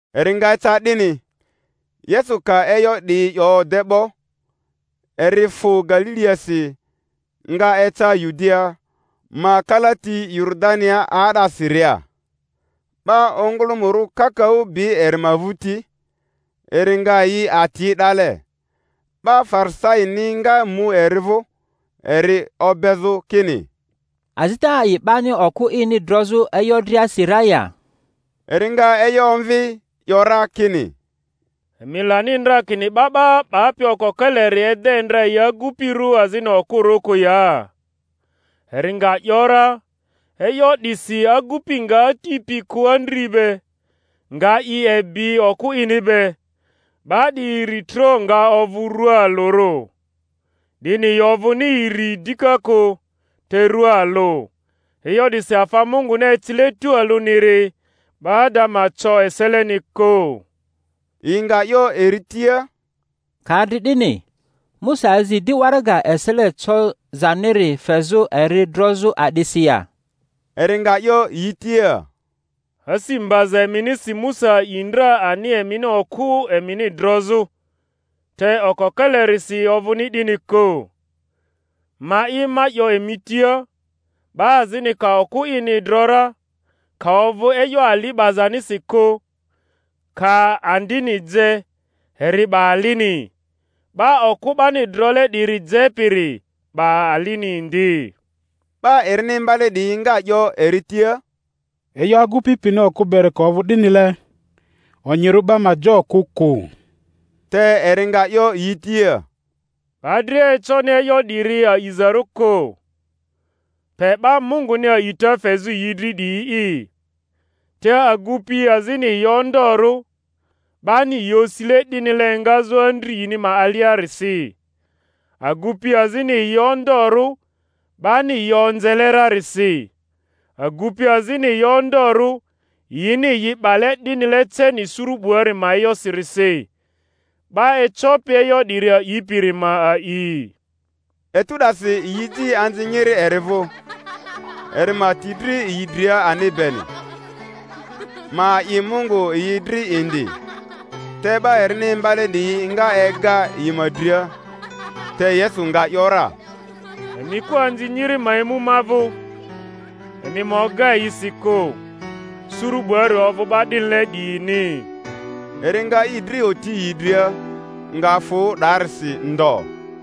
Eri nga eca 'dini, Yesu ka e'yo 'diyi 'yo de 'bo, eri fᴜ Galiliasi, nga eca Yudia ma kalati Yoridania 'aa'dasiria; 'ba ongᴜlᴜmᴜrᴜ kakaᴜ bi eri ma vᴜti, eri nga yi ati 'dale. 'Ba Farisaini nga mu eri vᴜ, eri obezᴜ kini, Azita a'i 'bani okᴜ ini drozᴜ e'yo driasi ra ya? Eri nga e'yo omvi, 'yo ra kini, Emi lani ndra kini 'ba 'ba 'bapi okokeleri ede ndra yi agupirᴜ azini okᴜrᴜ kᴜ ya? Eri nga ‘yora, E'yo 'disi agupi nga ati pi kᴜ andri be, nga i ebi okᴜ ini be; 'ba 'diyi iritro nga ovᴜ rua alᴜrᴜ. 'Dini yi ovᴜni iri dika kᴜ, te rua alᴜ. E'yo 'disi afa Munguni ecile tualᴜniri, 'ba ada ma co eseleni kᴜ. Yi nga 'yo eri tia, Ka adri 'dini, Musa azi di waraga esele cozaniri fezᴜ eri drozᴜ a'disi ya? Eri nga 'yo yi tia, Asi mbaza eminisi Musa a'i ndra ani emini okᴜ emini drozᴜ, te okokelerisi ovᴜni'dini kᴜ. Ma'i, ma 'yo emi tia: 'ba azini ka okᴜ ini dro ra, ka ovᴜ e'yo ali 'bazanisi kᴜ, ka andini je, eri 'ba alini; 'ba okᴜ 'bani drole 'diri jepiri 'ba alini indi. 'Ba erini imbale 'diyi nga 'yo eri tia, E'yo agupi pini okᴜ beri ka ovᴜ 'dinile, onyirᴜ 'ba ma je okᴜ kᴜ. Te eri nga 'yo yi tia, Ba dria econi e'yo 'diri aazarᴜ kᴜ, pe 'ba Munguni a'ita fezᴜ yi dri 'diyi'i. Te agupi azini yi ondorᴜ, 'bani yi osile 'dinile engazᴜ andri yini ma aliarisi; agupi azini yi ondorᴜ 'bani yi onzele rarisi; agupi azini yi ondorᴜ yini yi 'bale 'dinile ceni suru 'buari ma e'yosirisi. 'Ba ecopi e'yo 'diri a'ipiri ma a'i. Etu 'dasi yi eji anzi nyiri eri vᴜ, eri ma ti dri yi dria ani beni, ma a'i Mungu yi dri indi; te 'ba erini imbale 'diyi nga ega yi ma dria. Te Yesu nga ‘yora, Emi kᴜ anzi nyiri ma emu ma vᴜ, emi ma oga yi si kᴜ; suru 'buari ovᴜ 'ba 'dinile 'diyini. Eri nga i dri oti yi dria, nga fᴜ 'darisi ndo.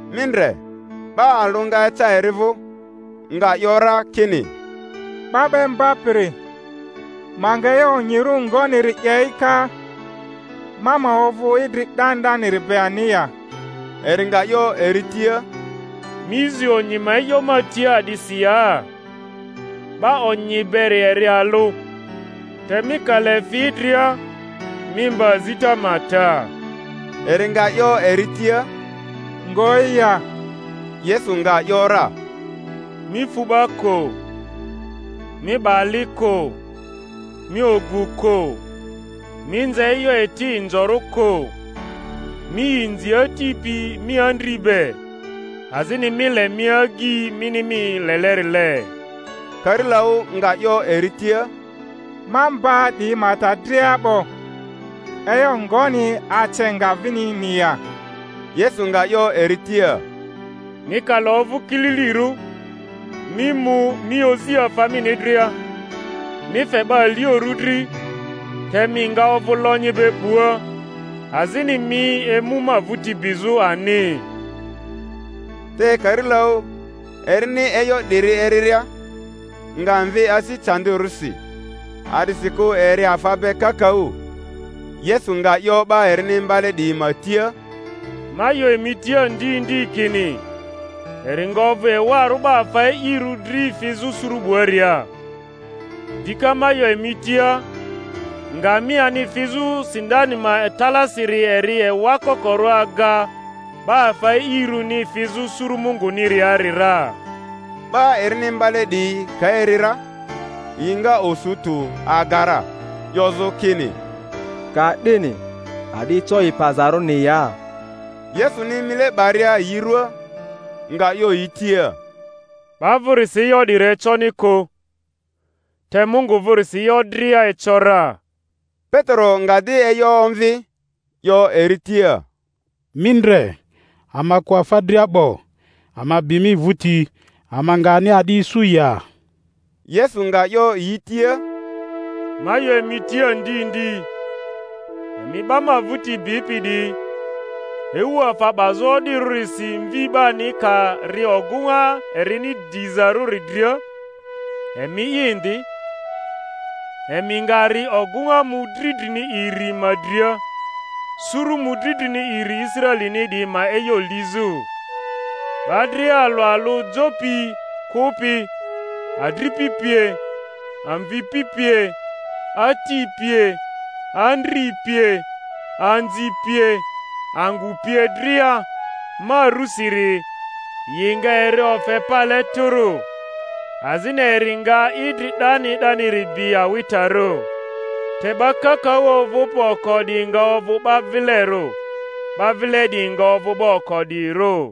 Mi ndre, 'ba alᴜ nga eca eri vᴜ, nga 'yo ra kini, 'Ba 'ba Imbapiri, ma nga e'yo onyirᴜ ngoniri 'ye'i ka, ma ma ovᴜ idri 'dani 'daniri be ani ya? Eri nga 'yo eri tia, Mi zi onyi ma e'yo ma tia a'disi ya? 'Ba onyi beri eri alᴜ. Te mi ka le fi idria, mi mba azita ma ta. Eri nga 'yo eri tia, Ngoyi ya? Yesu nga ‘yora, Mi fu 'ba kᴜ, Mi 'ba ali kᴜ, Mi ogu kᴜ, Mi nze e'yo eti inzorᴜ kᴜ, Mi inzi ati pi mi andri be, azini Mi le mi agyi mini mi lelerile. Karilaᴜ nga 'yo eri tia, Ma mba 'diyi ma ta dria 'bo; e'yo ngoni ace nga vinini ya? Yesu nga 'yo eri tia, Mi ka le ovᴜ kililirᴜ, mi mu, mi ozi afa mini dria, mi fe 'ba aliorᴜ dri, te mi nga ovᴜ lonyi be 'bua; azini mi emu ma vᴜti bizᴜ ani. Te karilaᴜ, erini e'yo 'diri eriria, nga mvi asi candirᴜsi; a'disikᴜ eri afa be kakaᴜ. Yesu nga 'yo 'ba erini imbale 'diyi ma tia, Ma 'yo emi tia ndi ndi, kini, eri nga ovᴜ ewarᴜ 'ba afa e'irᴜ dri fizᴜ suru 'buaria. Dika ma 'yo emi tia, Ngamiani fizᴜ sindani ma talaasiri eri ewa kokorᴜ aga 'ba afa e'irᴜni fizᴜ suru Munguniari ra. 'Ba erini imbale 'diyi ka eri ra, yi nga osu tᴜ aga ra, 'yozᴜ kini, Ka'dini a'di eco i pazarᴜni ya? Yesuni mile 'baria yi ruaa, nga 'yo yi tia, 'Ba vᴜrisi e'yo 'diri econi kᴜ, te Mungu vᴜrisi e'yo dria eco ra. Petero nga di e'yo omvi, 'yo eri tia, Mi ndre, ama kᴜ afa dria 'bo, ama bi mi vᴜti. Ama nga ani a'di isu ya? Yesu nga 'yo yi tia, Ma 'yo emi tia ndi ndi, emi 'ba ma vᴜti bipi 'diyi, ewu afa 'bazᴜ o'dirᴜrisi Mvi 'bani ka ri ogᴜŋa erini dizarᴜri dria, emi'i indi, emi nga ri ogᴜŋa mᴜdri drini iri ma dria, suru mᴜdri drini iri Israelini 'diyi ma e'yo iizᴜ. 'Ba dria alᴜ alᴜ jo pi kᴜpi, adripi pie, amvipi pie, ati pie, andri pie, anzi pie, angᴜ pie dria, ma rusiri, yi nga eri ofe pale tᴜrᴜ, azini eri nga idri 'dani 'daniri bi awitarᴜ. Te 'ba kakaᴜ ovᴜpi oko 'diyi nga ovᴜ 'ba vilerᴜ; 'ba vile 'diyi nga ovᴜ 'ba oko 'diyirᴜ.